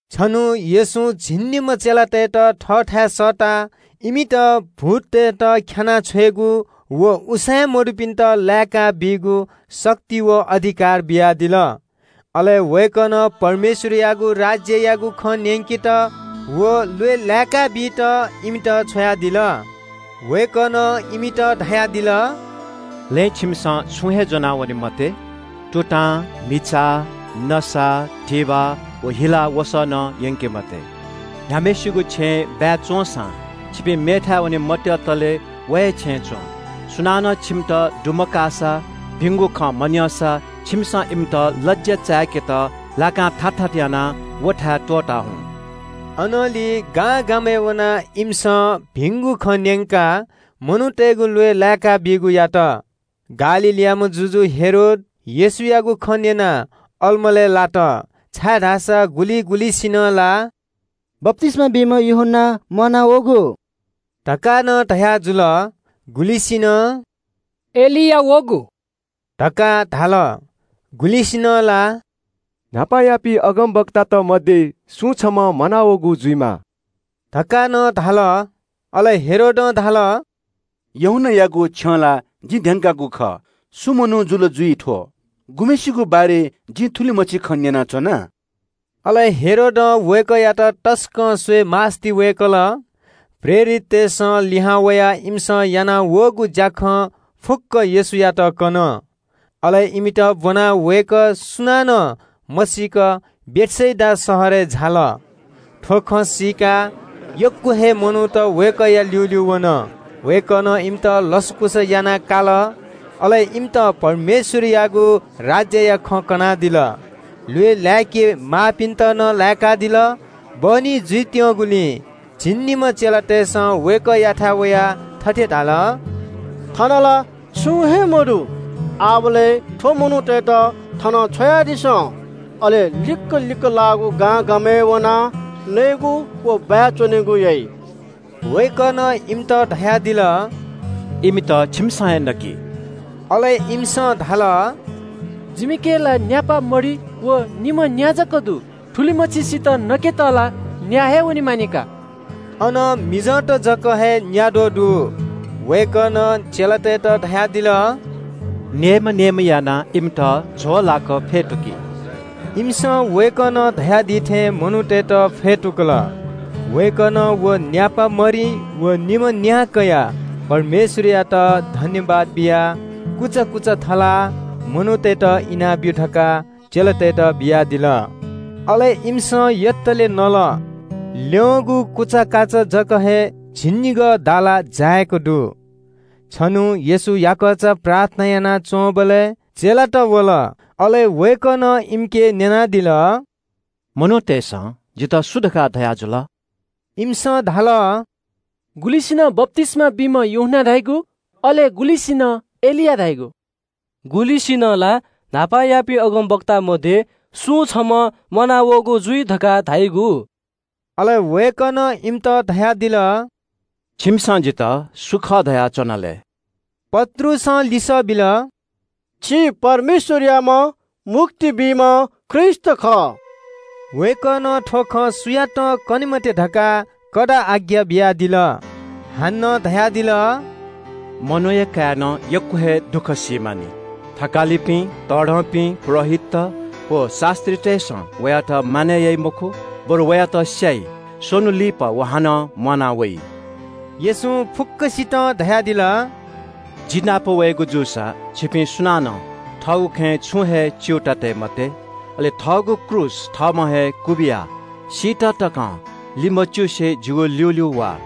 छन्‍हु येशूं झिंनिम्‍ह चेलातय्‌त थःथाय् सःताः इमित भूततय्‌त ख्‍यानाः छ्वयेगु व उसाँय् मदुपिन्‍त लाय्‌काबीगु शक्ति व अधिकार बियादिल। अले वय्‌कलं परमेश्‍वरयागु राज्‍ययागु खँ न्‍यंकेत व ल्‍वय् लाय्‌काबीत इमित छ्वयादिल। वय्‌कलं इमित धयादिल – “लँय् छिमिसं छुं हे ज्‍वनावने मते। तुतां, म्‍हिचा, नसा, धिबा व हिला वसः नं यंके मते। न्‍ह्याम्‍हय्‌सिगु छेँय् बाय् च्‍वंसां छिपिं मेथाय् वने मत्‍यंतले व हे छेँय् च्‍वँ। सुनानं छिमित दुमकाःसा, भिंगु खँ मन्‍यंसा छिमिसं इमित लज्‍या चाय्‌केत पालि च्‍वंगु धू तकं थाथा यानाः व थाय् त्‍वःता हुँ।” अनंलि गांगामय् वनाः इमिसं भिंगु खँ न्‍यंकाः मनूतय्‌गु ल्‍वय् लाय्‌काबीगु यात। गालीलयाम्‍ह शासक हेरोद येशूयागु खँ न्‍यनाः अलमलय् लात, छाय्‌धाःसा गुलिं गुलिंसिनं ला बप्‍तिस्‍मा बीम्‍ह यूहन्‍ना म्‍वानावःगु धकाः नं धयाजुल। गुलिसिनं एलिया वःगु धकाः धाल। गुलिसिनं ला न्‍हापायापिं अगमवक्तात मध्‍ये सुं छम्‍ह म्‍वानावःगु जुइमाः धकाः नं धाल। अले हेरोदं धाल – “यूहन्‍नायागु छ्यं ला जिं ध्‍यंके धुन। थ्‍व सु मनू जुल, गुम्‍हय्‌सिगु बारे जिं थुलिमछि खँ न्‍यनाच्‍वना?” अले हेरोदं वय्‌कःयात तसकं स्‍वयेमास्‍ति वय्‌कल। प्रेरिततय्‌सं लिहां वयाः इमिसं यानावःगु ज्‍याखँ फुक्‍क येशूयात कन। अले इमित ब्‍वनाः वय्‌कः सुनानं मसीक बेथसेदा शहरय् झाल। थ्‍व खँ सीकाः ग्‍वाः ग्‍वाः हे मनूत वय्‌कःया ल्‍यूल्‍यू वन। वय्‌कलं इमित लसकुस यानादिल। अले इमित परमेश्‍वरयागु राज्‍यया खँ कनादिल। ल्‍वय् लाय्‌के माःपिन्‍त नं लाय्‌कादिल। बहनी जुइत्‍यंगुलिं झिंनिम्‍ह चेलातय्‌सं वय्‌कःयाथाय् वयाः थथे धाल – “थन ला छुं हे मदु। आः थ्‍व मनूतय्‌त थनं छ्वयादिसँ। अले लिक्‍क लिक्‍क लाःगु गांगामय् वनाः नयेगु व बाय् च्‍वनेगु याइ।” वय्‌कलं धयादिल – “इमित छिमिसं हे नकि।” अले इमिसं धाल – “जिमिके ला न्‍यापा मरि व निम्‍ह न्‍या जक दु। थुलिमछिसित नकेत ला न्‍याः हे वनेमानि का।” अन मिजंत जक हे न्‍याद्वः दु। वय्‌कलं चेलातय्‌त धयादिल – “नेय्‌म्‍ह नेय्‌म्‍ह यानाः इमित झ्‍वःलाक फ्‍यतुकि।” इमिसं वय्‌कलं धयादी थें मनूतय्‌त फ्‍यतुकल। वय्‌कलं व न्‍यापा मरि व निम्‍ह न्‍या कयाः परमेश्‍वरयात सुभाय् बियाः कुचा थलाः मनूतय्‌त इनाब्‍यु धकाः चेलातय्‌त बियादिल। अले इमिसं यतले नल। इनाः ल्‍यं दुगु कुचाकाचा जक हे झिंनिगः दाला जाय्‌क दु। छन्‍हु येशू याकःचा प्रार्थना यानाच्‍वंबलय् चेलात वल। अले वय्‌कलं इमिके न्‍यनादिल – “मनूतय्‌सं जितः सु धकाः धयाजुल?” इमिसं धाल – “गुलिसिनं बप्‍तिस्‍मा बीम्‍ह यूहन्‍ना धाइगु, अले गुलिंसिनं एलिया धाइगु, गुलिंसिनं ला न्‍हापायापिं अगमवक्तात मध्‍ये सुं छम्‍ह म्‍वानावःगु जुइ धकाः धाइगु।” अले वय्‌कलं इमित धयादिल – “छिमिसं जितः सु खः धयाच्‍वना लय्?” पत्रुसं लिसः बिल – “छि परमेश्‍वरयाम्‍ह मुक्ति बीम्‍ह ख्रीष्‍ट खः।” वय्‌कलं थ्‍व खँ सुयातं कने मते धकाः कडा आज्ञा बियादिल। हानं धयादिल – “मनूया काय्‌नं यक्‍व हे दुःख सी मानि। थकालिपिं, तःधंपिं पुजाहारीत, व शास्‍त्रीतय्‌सं वयात मानय् याइ मखु, बरु वयात स्‍याइ, स्‍वन्‍हु लिपा व हानं म्‍वाना वइ।” येशूं फुक्‍कसितं धयादिल – “जि नाप वयेगु जूसा छिपिं सुनानं थःगु खँय् छुं हे च्‍यूताः तये मते। अले थःगु क्रूस थःम्‍हं हे क्‍वबिया सीत तकं लिमच्‍युसे जिगु ल्‍यूल्‍यू वा।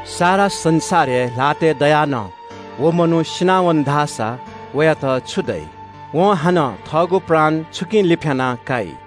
सारा संसार हे ल्‍हातय् दयाः नं व मनू सिनावन धाःसा वयात छु दइ? वं हानं थःगु प्राण छुकिं लिफ्‍याना काइ?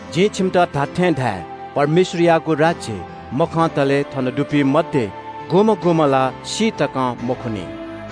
जिं छिमित धात्‍थें धाये – परमेश्‍वरयागु राज्‍य मखंतले थन दुपिं मध्‍ये गुम्‍हं गुम्‍हं ला सी तकं मखुनि।”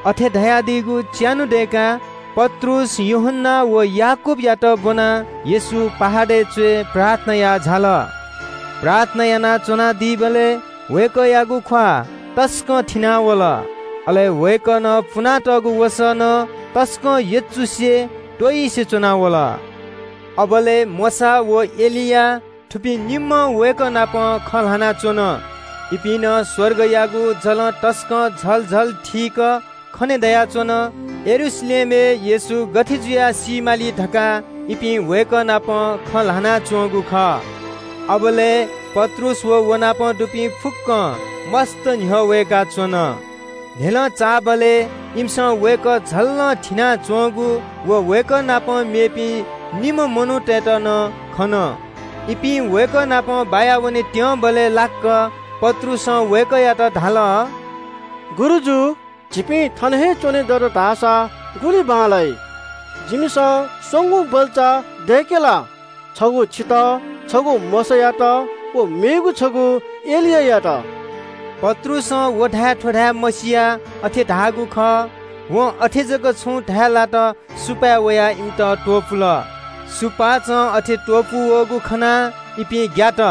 अथे धयादीगु च्‍यान्‍हु दय्‌काः पत्रुस, यूहन्‍ना व याकूबयात ब्‍वनाः येशू पर्वतया च्‍वय् प्रार्थना याः झाल। प्रार्थना यानाच्‍वनादीबलय् वय्‌कःयागु ख्‍वाः तसकं थिनावल, अले वय्‌कलं पुनातःगु वसः नं तसकं यचुसे त्‍वइसे च्‍वना वल। अबलय् मोशा व एलिया, थुपिं निम्‍ह वय्‌कः नाप खँ ल्‍हानाच्‍वन। इपिं नं स्‍वर्गयागु जलं तसकं झल झल थीक खने दयाच्‍वन। यरूशलेमय् येशू गथे जुयाः सी माली धकाः इपिं वय्‌कः नाप खँ ल्‍हानाच्‍वंगु खः। अबलय् पत्रुस व व नाप दुपिं फुक्‍कं मस्‍तं न्‍ह्यः वय्‌काच्‍वन। न्‍ह्यलं चाःबलय् इमिसं वय्‌कः झल्‍ल थिनाच्‍वंगु व वय्‌कः नाप मेपिं निम्‍ह मनूतय्‌त नं खन। इपिं वय्‌कः नाप बाया वनेत्‍यंबलय् लाक्‍क पत्रुसं वय्‌कःयात धाल – “गुरुजु, झीपिं थन हे च्‍वने दत धाःसा गुलि बांलाइ। जिमिसं स्‍वंगू बल्‍चा दय्‌के ला? छगू छितः, छगू मोशायात व मेगु छगू एलियायात।” पत्रुसं व धाये थ्‍व धाये मसियाः अथे धाःगु खः। वं अथे जक छु धाये लात सुपाँय् वयाः इमित त्‍वपुल। सुपाँचं अथे त्‍वपू वःगु खनाः इपिं ग्‍यात।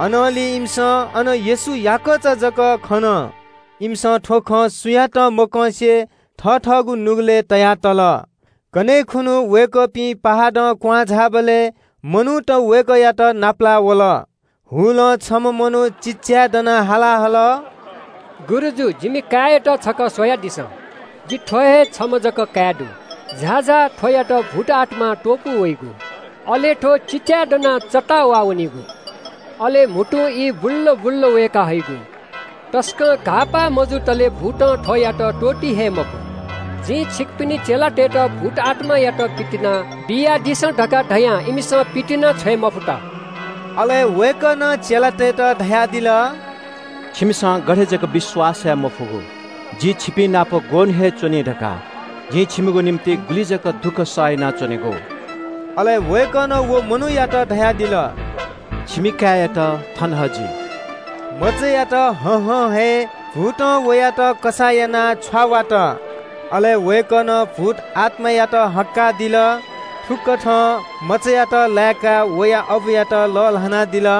अनंलि इमिसं अन येशू याकःचा जक खन। इमिसं थ्‍व खँ सुयातं मकंसे थथःगु नुगलय् तया तल। कन्‍हय् खुन्‍हु वय्‌कःपिं पर्वतं क्‍वहां झाःबलय् मनूत वय्‌कःयात नापलाः वल। हुलं छम्‍ह मनू चिल्‍लाय्‌दनाः हाला हल – “गुरुजु, जिमि काय्‌यात छकः स्‍वयादिसँ। जि थ्‍व हे छम्‍ह जक काय् दु। झाःझाः थ्‍वयात भूतआत्‍मां त्‍वपू वइगु, अले थ्‍व चिल्‍लाय् दनाः चत्ताः वाःवनिगु। अले म्‍हुतुं ई बुल्‍ल बुल्‍ल वय्‌काहइगु। तसकं घाःपाः मजुतले भूतं थ्‍वयात त्‍वःती हे मखु। जिं छिकपिनि चेलातय्‌त भूतआत्‍मायात पितिना बियादिसँ धकाः धयां इमिसं पितिनाछ्वये मफुत।” अले वय्‌कलं चेलातय्‌त धयादिल – “छिमिसं गथे जक विश्‍वास याये मफुगु? जि छिपिंनाप ग्‍वःन्‍हु हे च्‍वनी धकाः? जिं छिमिगु निंतिं गुलि जक दुःख सह यानाच्‍वनेगु?” अले वय्‌कलं व मनूयात धयादिल। “छिमि काय्‌यात थन हजि।” मचायात हहं हे भूतं वयात कसाः यानाः छ्वावात। अले वय्‌कलं भूतआत्‍मायात हक्‍कादिल। थुकथं मचायात लाय्‌काः वया अबुयात लःल्‍हानादिल।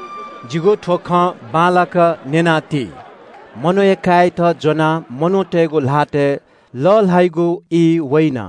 “जिगु थ्‍व खँ बांलाक न्‍यना ति। मनूया काय्‌यात ज्‍वनाः मनूतय्‌गु ल्‍हातय् लःल्‍हाइगु ई वइन।”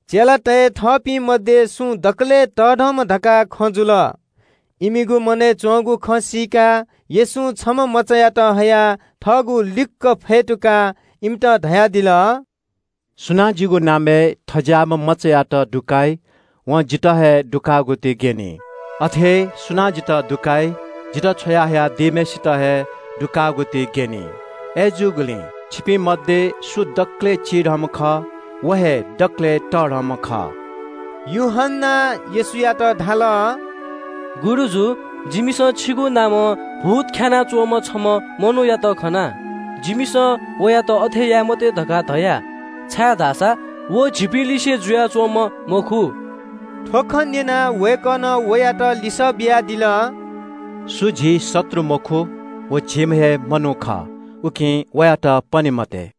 चेलातय् थःपिं मध्‍ये सु दकलय् तःधं धकाः खँ जुल। इमिगु मनय् च्‍वंगु खँ सीकाः येशूं छम्‍ह मचायात हयाः थःगु लिक्‍क फ्‍यतुकाः इमित धयादिल – “सुनां जिगु नामय् थज्‍याःम्‍ह मचायात दुकाइ, वं जितः हे दुकाःगु ति ग्‍यनी। अथे हे सुनां जितः दुकाइ, जितः छ्वया हयादीम्‍हय्‌सित हे दुकाःगु ति ग्‍यनी। अय्‌जूगुलिं छिपिं मध्‍ये सु दकलय् चिधंम्‍ह खः, व हे दकलय् तःधंम्‍ह खः।” यूहन्‍नां येशूयात धाल – “गुरुजु, जिमिसं छिगु नामं भूत ख्‍यानाः च्‍वंम्‍ह छम्‍ह मनूयात खना। जिमिसं वयात अथे याये मते धकाः धया, छाय्‌धाःसा व झीपिंलिसे जुयाच्‍वंम्‍ह मखु।” थ्‍व खँ न्‍यनाः वय्‌कलं वयात लिसः बियादिल – “सु झी शत्रु मखु व झीम्‍ह हे मनू खः, उकिं वयात पने मते।”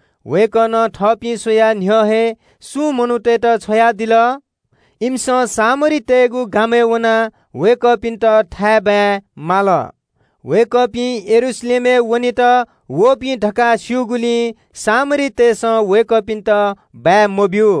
वय्‌कलं थःपिं स्‍वयाः न्‍ह्यः हे सुं मनूतय्‌त छ्वयादिल। इमिसं सामरीतय्‌गु गामय् वनाः वय्‌कःपिन्‍त थाय्‌बाय् माल। वय्‌कःपिं यरूशलेमय् वनेत वःपिं धकाः स्‍यूगुलिं सामरीतय्‌सं वय्‌कःपिन्‍त बाय् मब्‍यू।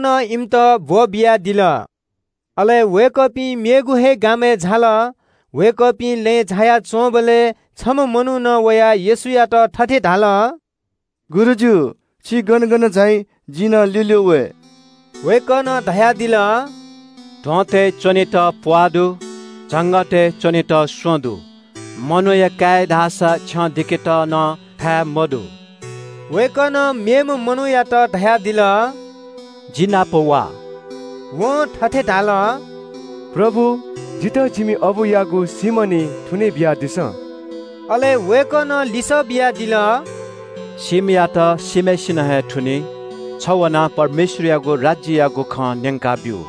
वय्‌कलं इमित ब्‍वःबियादिल। अले वय्‌कःपिं मेगु हे गामय् झाल। वय्‌कःपिं लँय् झाया च्‍वंबलय् छम्‍ह मनुखं वयाः येशूयात थथे धाल – “गुरुजु, छि गन गन झाइ, जि नं ल्‍यूल्‍यू वये।” वय्‌कलं धयादिल – “ध्‍वंतय् च्‍वनेत प्‍वाः दु, झंगःतय् च्‍वनेत स्‍वँ दु, मनूया काय्‌या धाःसा छ्यं दिकेत नं थाय् मदु।” वय्‌कलं मेम्‍ह मनूयात धयादिल – “जि नाप वा।” वं थथे धाल – “प्रभु, जितः जिमि अबुयागु सीम्‍ह निं थुने बियादिसँ।” अले वय्‌कलं लिसः बियादिल – “सीम्‍हयात सीम्‍हय्‌सिनं हे थुनी। छ वनाः परमेश्‍वरयागु राज्‍ययागु खँ न्‍यंकाब्‍यु।”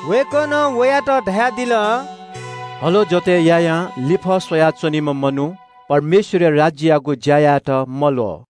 वय्‌कलं वयात धयादिल – “हलो जोतय् यायां लिफः स्‍वया च्‍वनीम्‍ह मनू परमेश्‍वरया राज्‍ययागु ज्‍या यायेत मल्‍वः।”